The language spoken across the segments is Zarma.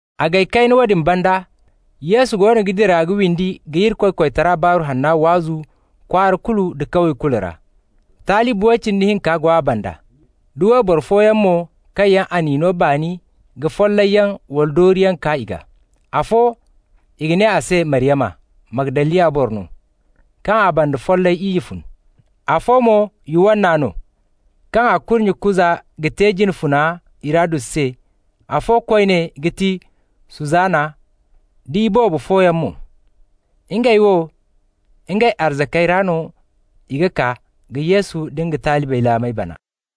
A gay kayna woodin banda, Yesu goono ga dira ka windi ka Irikoy koytara Baaru Hanna waazu kwaara kulu nda kawye kulu ra. Talibi way cindi hinka go a banda, da wayboro fooyaŋ mo kaŋ yaŋ a n'i no baani ka follayyaŋ wala dooriyaŋ kaa i gaa. Afo, i ga ne a se Maryama, Magdaliya boro no, kaŋ a banda follay iyye fun. Afo mo Yuwanna no, kaŋ a kurnye Kuza ga te jine funa Hirodus se, afo koyne ga ti Suzana, da iboobo fooyaŋ mo. Ngey wo, ngey arzakey ra no i ga kaa ka Yesu nda nga talibey laamey bana.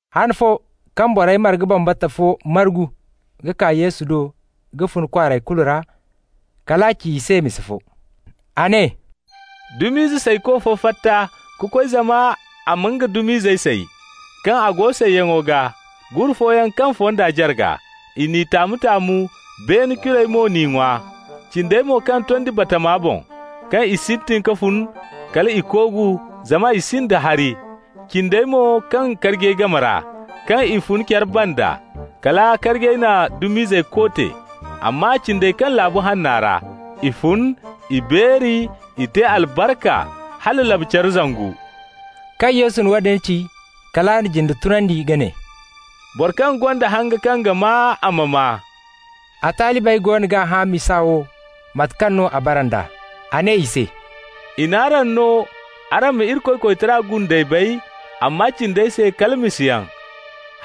Han fo, kaŋ borey marga bambata fo margu ka kaa Yesu do ka fun kwaarey kulu ra, kal a ci i se misa fo. A ne: «Dum'izey sayko fo fatta ka koy zama a ma nga dum'izey say. Kaŋ a go sayyaŋo gaa, gure fooyaŋ kaŋ fonda jarga. I n'i taamu-taamu, beene curey mo n'i ŋwa. Cindey mo kaŋ tondi batama boŋ. Kaŋ i sintin ka fun, kal i koogu, zama i sinda hari. Cindey mo kaŋ karjey game ra. Kaŋ i fun care banda, kala karjey na dum'izey koote. Amma cindey kaŋ laabu hanna ra. I fun, i beeri, i te albarka, hala labu-care zangu.» Kaŋ Yesu na woodin ci, kal a na jinde tunandi ka ne: «Boro kaŋ gonda hanga kaŋ ga maa, a ma maa!» A talibey goono g'a hã misa wo, mate kaŋ no a bara nd'a. A ne i se: «I n'araŋ no araŋ ma Irikoy koytara gundey bay, amma cindey se, kala misayaŋ,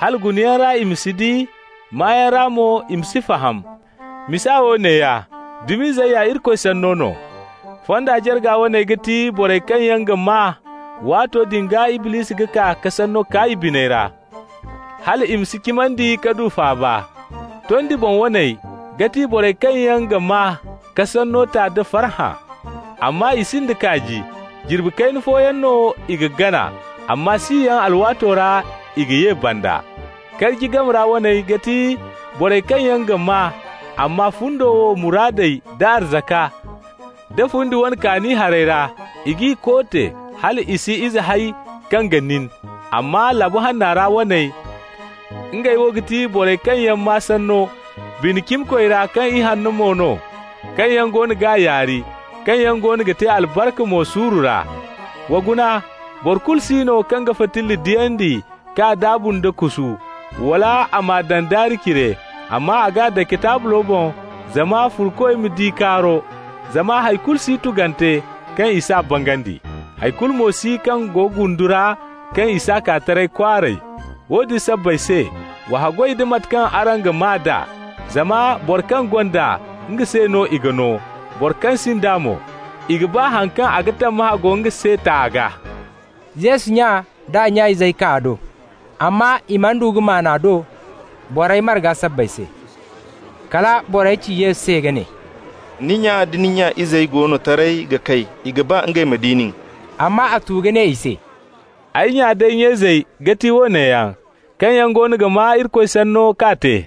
‹hala gunayaŋ ra i ma si di, maayaŋ ra mo i ma si faham.› Misa wo neeya: Dum'izey ya Irikoy Sanno no. Fonda jarga waney ga ti borey kaŋ yaŋ ga maa, waato din gaa Iblisi ga kaa ka sanno kaa i biney ra, hal i ma si cimandi ka du faaba. Tondi boŋ waney ga ti borey kaŋ yaŋ ga maa, ka sanno ta nda farhã. Amma i sinda kaaji. Jirbi kayna fooyaŋ no i ga gana, amma siyaŋ alwaato ra i ga ye banda. Karji game ra waney ga ti borey kaŋ yaŋ ga maa, amma fundo wo muraadey d'a arzaka, da fundi woone kaani harey ra, i g'i koote, hal i si ize hay kaŋ ga nin. Amma laabu hanna ra waney, ngey wo ga ti borey kaŋ yaŋ maa sanno bine cimikoy ra kaŋ ihanno mo no, kaŋ yaŋ goono g'a yaari, kaŋ yaŋ goono ga te albarka mo suuru ra. Wa guna. Boro kulu si no kaŋ ga fitilla diyandi k'a daabu nda kusu, wala a m'a daŋ daari cire, amma a g'a dake taablo boŋ zama furokoy ma di kaaro. Zama hay kulu si tugante kaŋ i s'a bangandi. Hay kulu mo si kaŋ go gundu ra kaŋ i s'a kaa taray kwaaray. Woodin sabbay se, wa haggoy da mate kaŋ araŋ ga maa d'a. Zama boro kaŋ gonda, nga se no i ga no. Boro kaŋ sinda mo, i ga baa haŋ kaŋ a ga tammahã go nga se ta a gaa.» Yesu nya d'a nya izey kaa a do, amma i mana du ka maan a do borey marga sabbay se. Kala borey ci Yesu se ka ne: «Ni nya da ni nya izey go no taray ga kay, i ga ba ngey ma di nin.» Amma a tu ka ne i se: «Ay nya d'ay nya izey ga ti woone yaŋ, kaŋ yaŋ goono ga maa Irikoy Sanno k'a te.»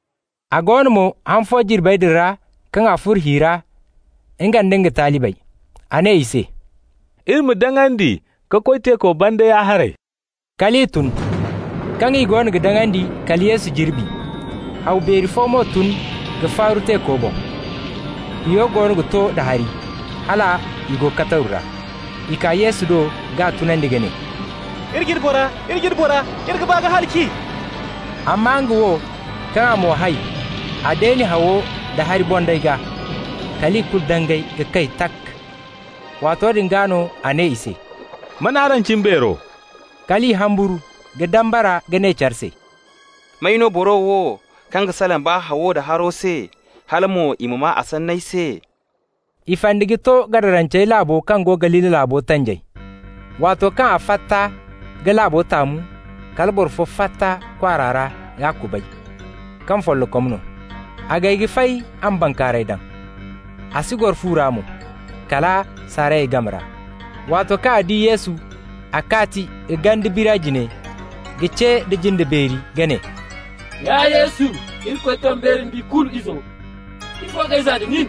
A go no mo, han fo jirbey din ra, kaŋ a furo hi ra, nga nda nga talibey. A ne i se: «Iri ma daŋandi ka koy teeko banda ya-haray.» Kal i tun. Kaŋ i goono ga daŋandi, kala Yesu jirbi. Haw beeri fo mo tun ka faaru teeko boŋ. Hiyo goono ga to da hari, hal i go kataru ra. I kaa Yesu do k'a tunandi ka ne: «Iri jine bora, iri jine bora, iri ga ba ka halaci!» Amma nga wo, kaŋ a mo hay, a deeni hawo da hari bondayey gaa. Kal i kulu dangay ka kay, tak! Waato din gaa no a ne i se: «Man araŋ cimbeero?» Kal i humburu, ka dambara ka ne care se: «May no boro wo kaŋ ga salaŋ baa hawo nda haro se, hala mo i maa a sanney se?» I fandi ka to Gadarancey laabo kaŋ go Galili laabo tanjay. Waato kaŋ a fatta ka laabo taamu, kala boro fo fatta kwaara ra k'a kubay, kaŋ follokom no. A gay ka fay a ma bankaaray daŋ, a si goro fu ra mo, kala saarayey game ra. Waato kaŋ a di Yesu, a kaati ka ganda biri a jine ka ce nda jinde beeri ka ne: « Ya Yesu, Irikoy kaŋ beeri da ikulu Izo, ifo k'ay zaa da nin?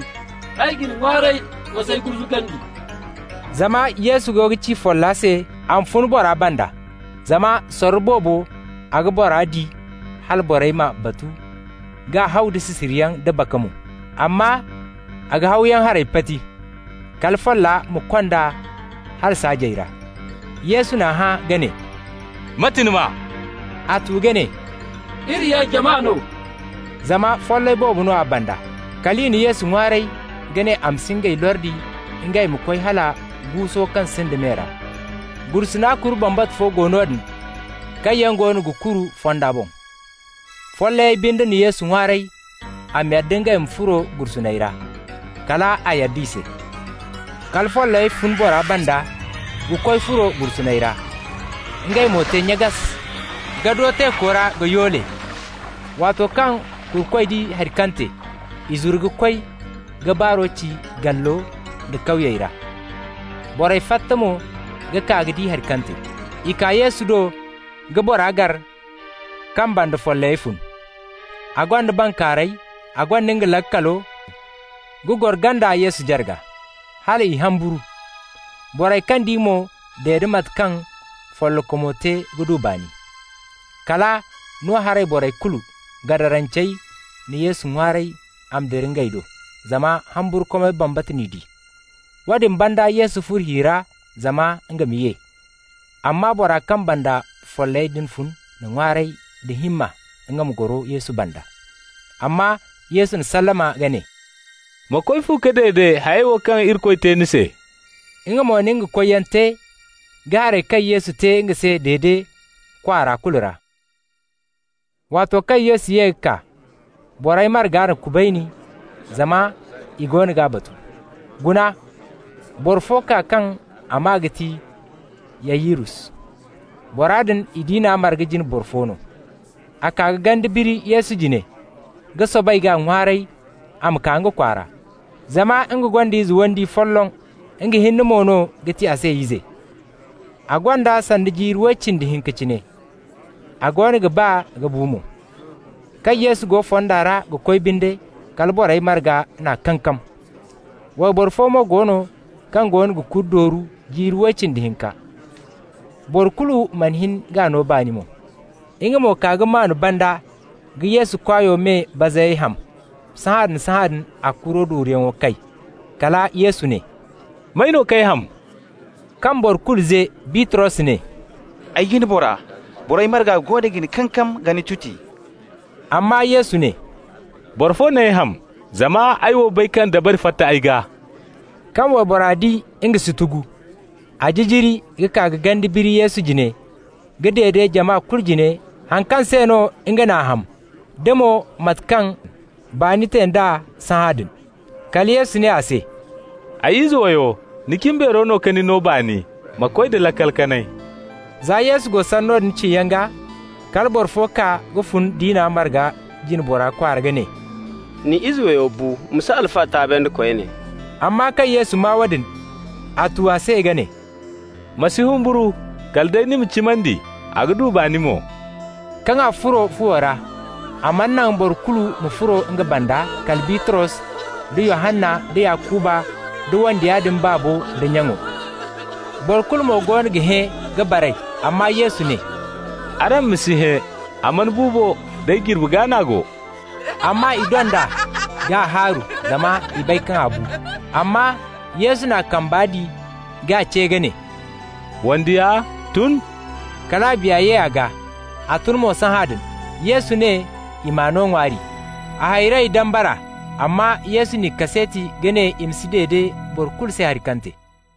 Ay ga ni ŋwaaray, ma s'ay gurzugandi!» (Zama Yesu goono ga ci folla se a ma fun bora banda.) Zama sorro boobo a ga bora di hala borey m'a batu k'a haw da sisiriyaŋ da baka mo. Amma a ga hawyaŋ harey pati, kala folla ma kond'a hala saajey ra. Yesu n'a hã ka ne: «Mate ni maa?» A tu ka ne: «Iri ya jama no.» (Zama follay boobo no a banda.) Kal i na Yesu ŋwaaray ka ne a ma si ngey lordi ngey ma koy hala guuso kaŋ sinda me ra. Gursuna kuru bambata fo go noodin, kaŋ yaŋ goono ga kuru fando boŋ. Follayey binde na Yesu ŋwaaray a ma yadda ngey ma furo gursuney ra. Kal a yadda i se. Kala follayey fun bora banda ka koy furo gursuney ra. Ngey mo te nyagas! ka do teeko ra ka yoole. Waato kaŋ kurukoy di haŋ kaŋ te, i zuru ka koy ka baaro ci gallo da kawyey ra. Borey fatta mo ka kaa ka di haŋ kaŋ te. I kaa Yesu do ka bora gar kaŋ banda follayey fun. A gonda bankaaray, a gonda nga laakalo, ga goro ganda Yesu jarga. Hal i humburu. Borey kaŋ di mo dede mate kaŋ follokomo te ka du baani. Kala no-haray borey kulu, Gadarancey, na Yesu ŋwaaray a ma dira ngey do, zama humburkumay bambata n'i di. Woodin banda Yesu furo hi ra zama nga ma ye. Amma bora kaŋ banda follayey fun din n'a ŋwaaray da himma nga ma goro Yesu banda. Amma Yesu n'a sallama ka ne: «Ma koy fu ka dede hayey wo kaŋ yaŋ Irikoy te ni se.» Nga mo na nga koyyaŋo te ka hayey kaŋ Yesu te nga se dede kwaara kulu ra. Waato kaŋ Yesu ye ka kaa, borey marga n'a kubayni, zama i goono g'a batu. Guna, boro fo kaa kaŋ a maa ga ti Yayirus. Bora din i diina marga jine boro fo no. A kaa ka ganda biri Yesu jine ka soobay k'a ŋwaaray a ma kaa nga kwaara, zama nga gonda ize wandiyo folloŋ, nga hinne mo no ga ti a se ize. A gonda sanda jiiri way cindi hinka cine, a goono ga ba ka bu mo. Kaŋ Yesu go fonda ra ga koy binde, kala borey marga n'a kankam. Wayboro fo mo go no kaŋ goono ga kuri dooru jiiri way cindi hinka. Boro kulu mana hin k'a no baani mo. Nga mo kaa ka maan banda ka Yesu kwaayo me bazayey ham. Sahãadin-sahãadin a kuro dooruyaŋo kay. Kala Yesu ne: «May no k'ay ham?» Kaŋ boro kulu ze, Bitros ne: «Ay jine bora, borey marga goono ga ni kankam ka ni tuti-tuti.» Amma Yesu ne: «Boro fo n'ay ham, zama ay wo bay kaŋ dabari fatta ay gaa.» Kaŋ waybora di nga si tugu, a jijiri ka kaa ka ganda biri Yesu jine ka dede jama kulu jine haŋ kaŋ se no nga n'a ham da mo mate kaŋ baani te d'a sahãadin. Kala Yesu ne a se: «Ay ize wayo, ni cimbeero no ka ni no baani. Ma koy da laakal kanay.» Za Yesu go sanno din ciyaŋ gaa, kala boro fo kaa ka fun diina marga jine bora kwaara ka ne: «Ni ize wayo bu. Ma si Alfa taabandi koyne.» Amma kaŋ Yesu maa woodin, a tu a se ka ne: «Ma si humburu, kala day ni ma cimandi, a ga du baani mo.» Kaŋ a furo fuwo ra, a mana naŋ boro kulu ma furo nga banda kala Bitros, da Yohanna, da Yakuba, da wandiya din baabo d'a nyaŋo. Boro kulu mo goono ga hẽ ka baray. Amma Yesu ne: «Araŋ ma si hẽ. A mana bu bo, day jirbi gaa n'a go.» Amma i dond'a k'a haaru, zama i bay kaŋ a bu. Amma Yesu n'a kamba di k'a ce ka ne: «Wandiya, tun!» Kal a biya ye a gaa. A tun mo sahãadin. Yesu ne i m'a no ŋwaari. A hayrey dambara, amma Yesu n'i kaseeti ka ne i ma si dede boro kulu se haŋ kaŋ te.